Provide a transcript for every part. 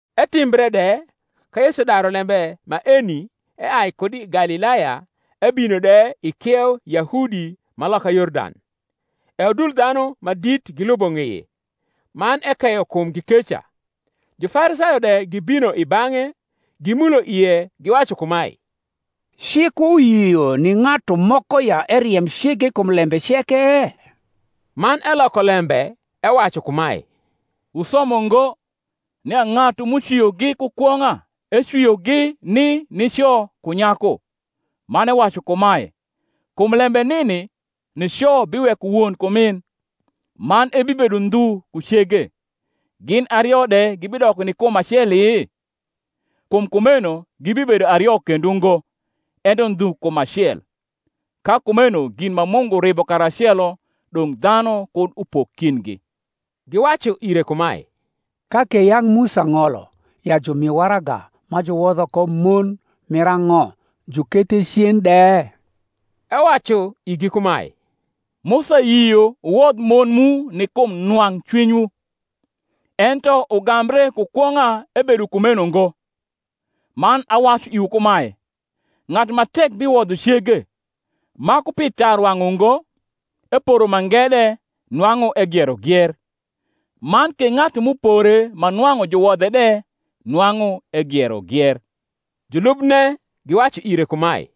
Etimbre de ka Yesu daru lembe maeni eai kud i Galilaya ebino de i kieu Yahudi ma loka Yordan: e udul dhanu ma dit gilubo ng’eye; man ekeyo kumgi keca. Jufarisayo de gibino i bang’e, gimulo ie, giwacu kumae, Cik uyio ni ng’atu moko ya eriem cege kum lembe ceke? Man eloko lembe ewacu kumae, Wusomo ngo, nia ng’atu m’ucwiogi ku kwong’a ecwiogi ni nico ku nyaku, man ewacu kumae, Kum lembe nini nico biweko won ku min, man ebibedo ndhu ku cege; gin ario de gibidoko ni kum aceli? Kum kumeno gibibedo ario kendo ngo, ento ndhu kum acel. Ka kumeno gin ma Mungu ribo karacelo, dong’ dhanu kud upok kindgi. Giwacu ire kumae, Ka ke yang’ Musa ng’olo ya jumi waraga ma juwodho ko mon mir ang’o, jukethe cen de? Ewacu igi kumae, Musa yio wuwodh mon mu ni kum nwang’ cwinywu: ento ugambre ku kwong’a ebedo kumeno ngo. Man awacu iwu kumae, Ng’atu ma tek biwodho cege, ma ku pi tarwang’ ungo, eporo mange de nwang’u egiero gier: man ke ng’atu m’upore ma nwang’u juwodhe de nwang’u egiero gier. Julubne giwacu ire kumae,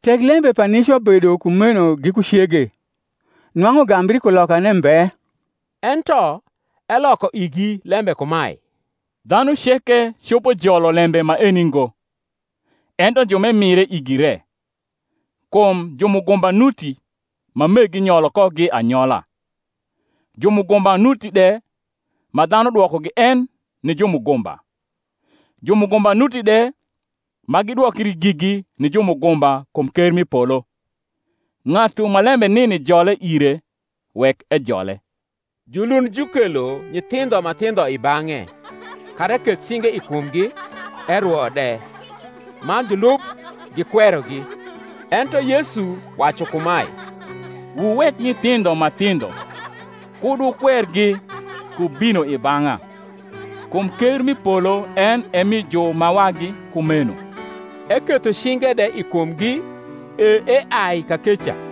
Tek lembe pa nico bedo kumeno giku cege, nwang’u gambri kulokane mbe. Ento eloko igi lembe kumae, Dhanu ceke copo jolo lembe maeni ngo, ento ju m’emire igi re. Kum jumugumba nuti, ma meggi nyolo kogi anyola: jumugumba nuti de, ma dhanu dwokogi en ni jumugumba: jumugumba nuti de, ma gidwokri gigi ni jumugumba kum ker m’i polo. Ng’atu ma lembe nini jole ire, wek ejole. Julund jukelo nyithindho ma thindho i bang’e, kara eketh cinge i kumgi, erwo de: man julub gikwerogi. Ento Yesu wacu kumae, Wuwek nyithindho ma thindho, kud wukwergi, ku bino i bang’a: kum ker m’i polo en e mi ju ma wagi kumeno. Eketho cinge de i kumgi, e eai kakeca.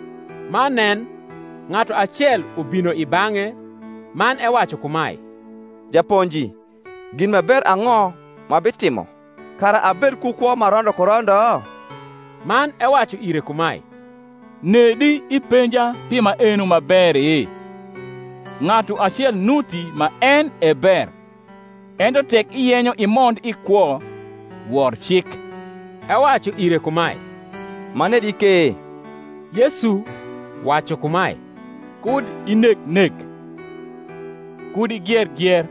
Man nen, ng’atu acel ubino i bang’e man ewacu kumae, Japonji, gin ma ber ang’o m’abitimo, kara abed ku kwo ma rondo ku rondo? Man ewacu ire kumae, Nedi ipenja pi maeno ma beri? Ng’atu acel nuti ma en e ber: ento tek iyenyo imond i kwo, wor cik. Ewacu ire kumae, Manedi ke? Yesu wacu kumae, Kud ineg nek, Kud igier gier,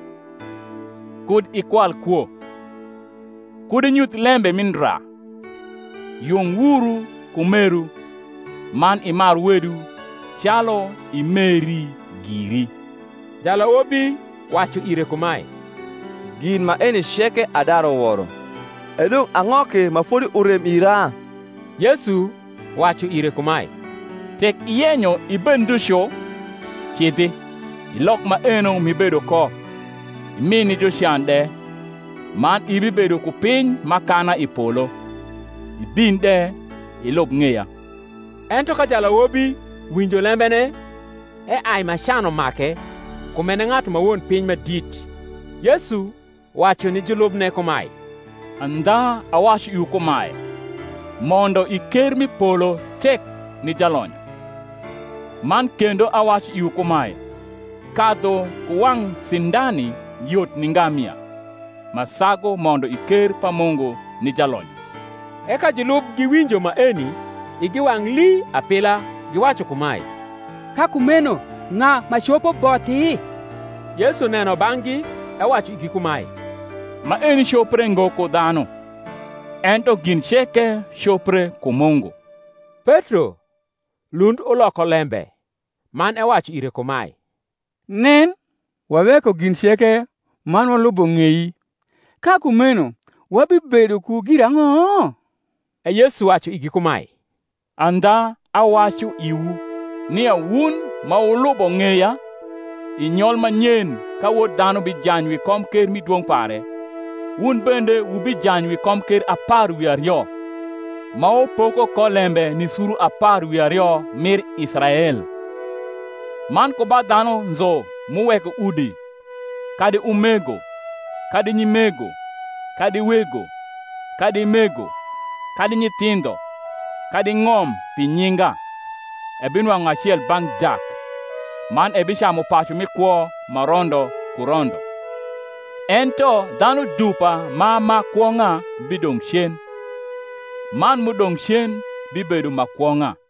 Kud ikwal kwo, Kud inyuth lembe mi ndra, Yung wuru ku meru, man, Imar wedu calu imeri giri. Jalawobi wacu ire kumae, Gin maeni ceke adaru woro: edong’ ang’o ke ma fodi urem ira? Yesu wacu ire kumae, Tek iyenyo ibed ndhu cu, cidhi, ilok maeno m’ibedo ko, imi ni jucan de, man ibibedo ku piny m’akana i polo: ibin de, ilub ng’eya. Ento ka jalawobi winjo lembene, eai ma can umake; kum en e ng’atu ma won piny ma dit. Yesu wacu ni julubne kumae, Andha awacu iwu kumae, Mondo i ker m’i polo tek ni jalonyo. Man kendo awacu iwu kumae, Kadhu ku wang’ sindani yot ni ngamia, ma sagu mondo i ker pa Mungu ni jalonyo. E ka julub giwinjo maeni, igi wang’ lii apiia, giwacu kumae, Ka kumeno ng’a ma copo bothi? Yesu neno bang’gi ewacu igi kumae, Maeni copre ngo ku dhanu; ento gin ceke copre ku Mungu. Petro lund uloko lembe man ewacu ire kumae, Nen, waweko gin ceke, man walubo ng’ei: ka kumeno wabibedo ku girang’o? E Yesu wacu igi kumae, Andha awacu iwu, Nia wun ma wniubo ng’eya, i nyol ma nyen ka Wod dhanu bijany wi komker mi dwong’ pare, wun bende wubijany wi komker apar wi ario, ma wupoko ko lembe ni suru apar wi ario rnir Israel. Man ku ba dhanu nzu m’uweko udi, kadi umego, kadi nyimego, kadi wego, kadi mego, kadi nyithindho, kadi ng’om pi nyinga, ebinwang’u acel bang’ dak man ebicamu pacu mi kwo ma rondo ku rondo. Ento dhanu dupa ma ma kwong’a bidong’ cen; man m’udong’ cen bibedo ma kwong’a.